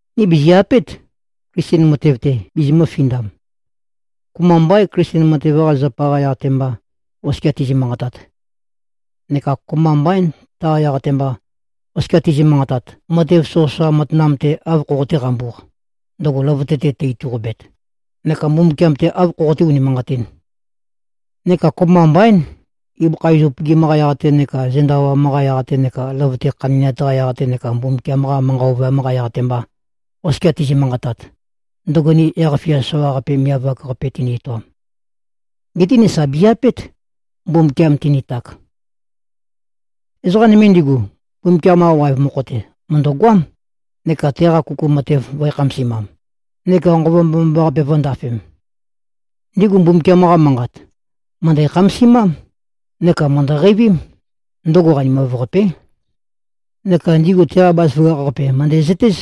Ni bìzi-apét, Klisten matev-te bizimø̄-findam. Kopømba mbaín, Klisten matev-qa zapa-qa yaq-te mba, oskia tizi꞉-manqatat. Neka kopømba mbaín, taqa yaq-te mba, oskia tizi꞉-manqatat, matev soqøsoqa matanam-te āv khoqoté-qambūq, ndøgo løvøte-te tø-ituqobet, neka Mbumbukiam-te āv khoqoté-unimanqatīn. Neka kopømba mbaín, ibøkha iz upøgim-qa yaq-te neka zenda awam-qa yaq-te neka løvøte-te khandi꞉nat-qa yaq-te neka Mbumbukiam-qa manqa ovøyam-qa yaq-te mba, oskia tizi꞉-manqatat, ndøgo ni yaq-fia soqaqape miav-ak-qape tøni-etoam. Geté ni sà bizi-apét, Mbumbukiam tinitak. Ezoqa nøme ndigu, Mbumbukiam-qa waev mokho-te mø̀ndøgoám, neka teqa kuku matev vø̄e-khamasimam, neka Nqova Mbomambaqape vø̄ndafem. Ndigu Mbumbukiam-qa Manqat, mø̀ndæ-khamasimám, neka mø̀ndø-qeivím, ndøgo qanimav-qapé. Neka ndigu teqa bazaføgakh-qape mø̀ndæzøtéz,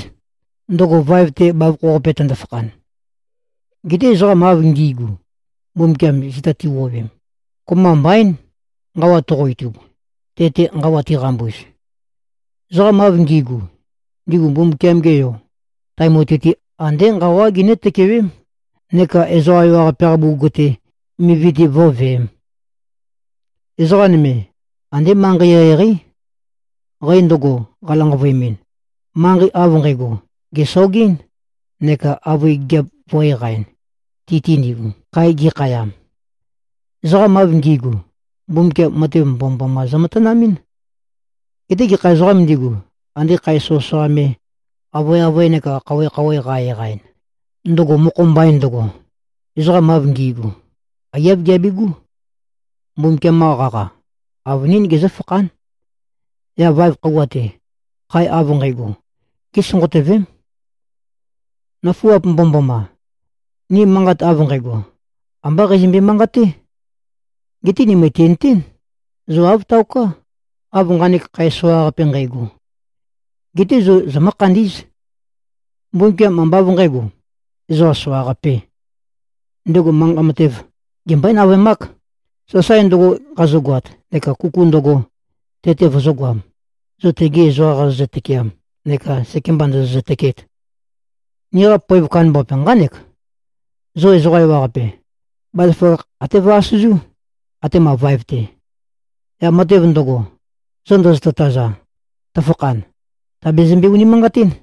ndøgo vaev-te bavokho-qape tøndo-fakhan. Geté ezoqam av ngi꞉gu, Mbumbukiam zita ti꞉wuowem, kopømba mbaín, nqawa toqo-itub, tete nqawa tiqambuz. Ezoqam av ngi꞉gu, ndigu Mbumbukiam-ge Yo, tae mutui-te, andé nqawá ginǿ-tøkewém neka ezoqa ewaqape-qa bugug-te, mivi-te vǿveēm. Ezoqa nøme, andé manqei eqeieqeí. Qæ ndøgo, qalanqavøemɨn, manqei av nqægo, gèsogɨ́n neka avøe gigiap vø̄-eqaɨn, ti-te ndigu, khae gikhayam. Ezoqam av ngi꞉gu, Mbumbukiam matev mbomømboma zømatanamɨ́n. Geté gekha ezoqām ndigu, ande khae soqøsoqa me, avøeavøe neka khouwe-khouwe qa-eqaɨn, ndøgo mokho mbain ndøgo, ezoqam av ngi꞉gu, aiyáv giabigú. Mbumbukiam-qa qaqa, avønín gezǿfakhán. Yaq vaev khøuwa-te, khae av nqægo, gésonqotøvém. Nøfuap mbomømboma! Ni manqat av nqægo, ambá qeizømbe-manqaté. Geté ni mø̀tinøtén, zo āv taoká, av nqanek khae soqaqape nqægo. Geté zo zomǿ-khandí꞉z. Mbumbukiam ambá av nqǣgo, ezoqa soqaqapē. Ndego manqa matev, gembøé-navøemák, sasae ndøgo qazogoat neka kuku ndøgo, te-te vøzø̄goam, zo tegi ezoqam qazozø-tøkeam neka sekemba ndozozø-tøkeet. Niqa poev kandambaqape nqánek: Zo ezoqa ewaqape, bazaføgakh até vø-asøzú, atema vaev-te. Yaq matev ndøgo, zo ndozoto-taza, tøfakhan, tàbezømbe-unimanqatín.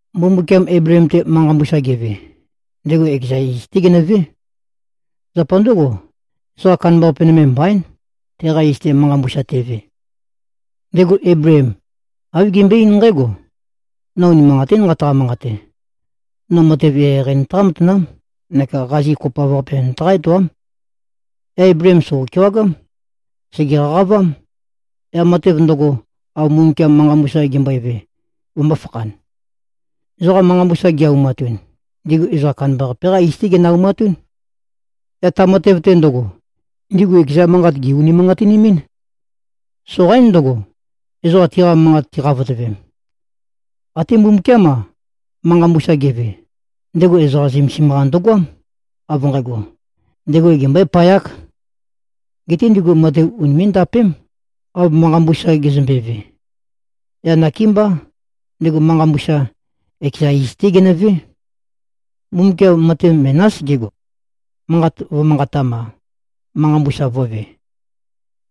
Mbumbukiam Eibleem-te manqa mbusa geve, ndego ekeza iz-té genøvé. Zapa ndǿgo, ezoqa kandambaqape nøme mbaín, teqa iz-te manqa mbusa teve. Ndego Eibleem, āv gembøe-eín nqǽgo, “No unimanqatín nqataqa-manqate. No matev eqeieqei nøtaqá-matanám neka qazi kopoav-qape nøtaqá-etoám.” Yaq Eibleem sògo-kewagám. Sège-qaqavám, yaq matev ndøgo, av Mbumbukiam manqa mbusa gembøeve, vømbō-fakhan. Ezoqa manqa mbusa gi-aumatun, ndigu ezoqa kandambaqape-qá iz-té ginø-aumatún. Yaq ta matev-te ndøgo, ndigu ekeza manqat gè-unimanqatinimín. Soqaín ndøgo, ezoqa tiqa manqat tiqavotømem. Até Mbumbukiám-a, manqa mbusa geve, ndego ezoqa zømesim-qa ndøgoám, av nqægo, ndego gembøépayák. Geté ndigu matev unimé꞉-ndapém, av manqa mbusa gezømbeve. Yaq nakémbá, ndego manqa mbusa, ekeza iz-té genøvé. Mbumbukiam matev menás gego. Manqat vø̄manqatam-a, manqa mbusa vø̄ve.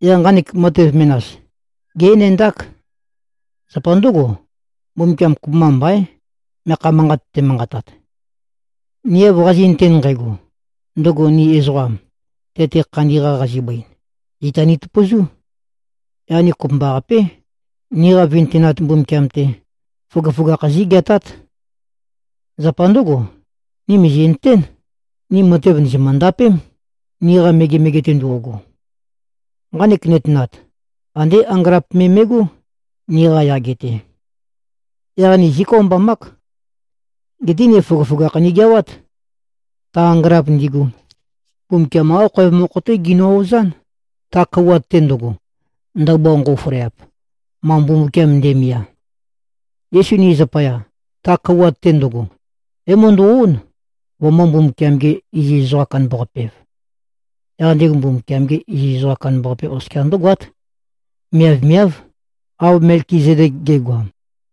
Yaq nqanek matev menas, gé-enendák. Zapa ndǿgo, Mbumbukiam kopømba mbaín, meakha manqat temanqatat. Ni av qazi꞉nøten nqægo, ndøgo ni ezoqam, te-te khandi-qa qazibøin, zita nitøpøzú. Yaq ni kopømbaqapé, niqa vintønat Mbumbukiam-te, føgøføgakh zígeatát. Zapa ndǿgo, ni mìzi꞉nøtén, ni matev ndìzimø-ndapém, niqa megemege-te ndo꞉go. Nqanek nøtenat, andé angølap me me꞉gó, niqa yage-te. Yaq ni zíkøombamák. Geté ni føgøføgakh nigeawát. Ta angølap ndigu, Mbumbukiam-qá khoev mokho-té ginø-ozán, ta kouwat-te ndøgo, ndabua nqo꞉føleap, ma Mbumbukiam nde꞉mia. Yesu ni zapaya, ta kouwat-te ndøgo, é-møndo꞉-ón, vømø̄-Mbumbukiam-ge-iziz-ezoqa-kandambaqape-ev. Yaq ndego Mbumbukiam-ge iziz ezoqa kandambaqape oskia ndǿgoát, miavmiáv, av Melkizedek ge꞉goam.